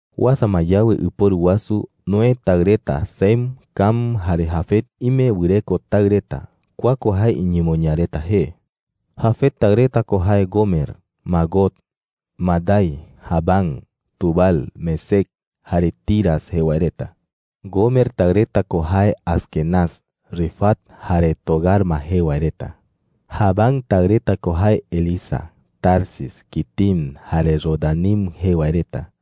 Uasa ma yawe ɨporu wasu, Noé taɨ reta Sem, Cam, jare Jafet ime wɨreko taɨ reta. Kua ko jae iñemoñaa reta jee: Jafet taɨ reta ko jae Gomer, Magog, Madai, Javán, Tubal, Mesec, jare Tiras jee wae reta. Gomer taɨ reta ko jae Asquenaz, Rifat, jare Togarma jee wae reta. Javán taɨ reta ko jae Elisa, Tarsis, Quitim, jare Rodanim jee wae reta.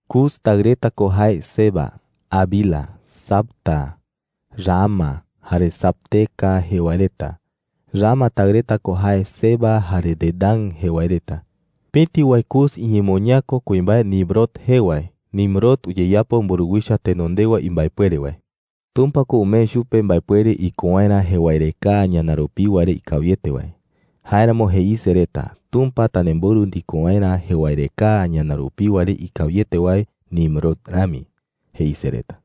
Cus taɨ reta ko jae Seba, Havila, Sabta, Raama, jare Sabteca jee wae reta. Raama taɨ reta ko jae Seba jare Dedán jee wae reta. Pëti wae Cus iñemoñaa ko kuimbae Nimrod jee wae. Nimrod uyeyapo mburuwicha tenondewa imbaepuere wae. Tumpa ko umee chupe mbaepuere iko waerä jewaerekaa ñana rupiwa re ikawiete wae. Jáeramo jeise reta: “Tumpa tanemborɨ ndiko waerä jewaerekaa ñana rupiwa re ikawiete wae Nimrod rami,” jeise reta. (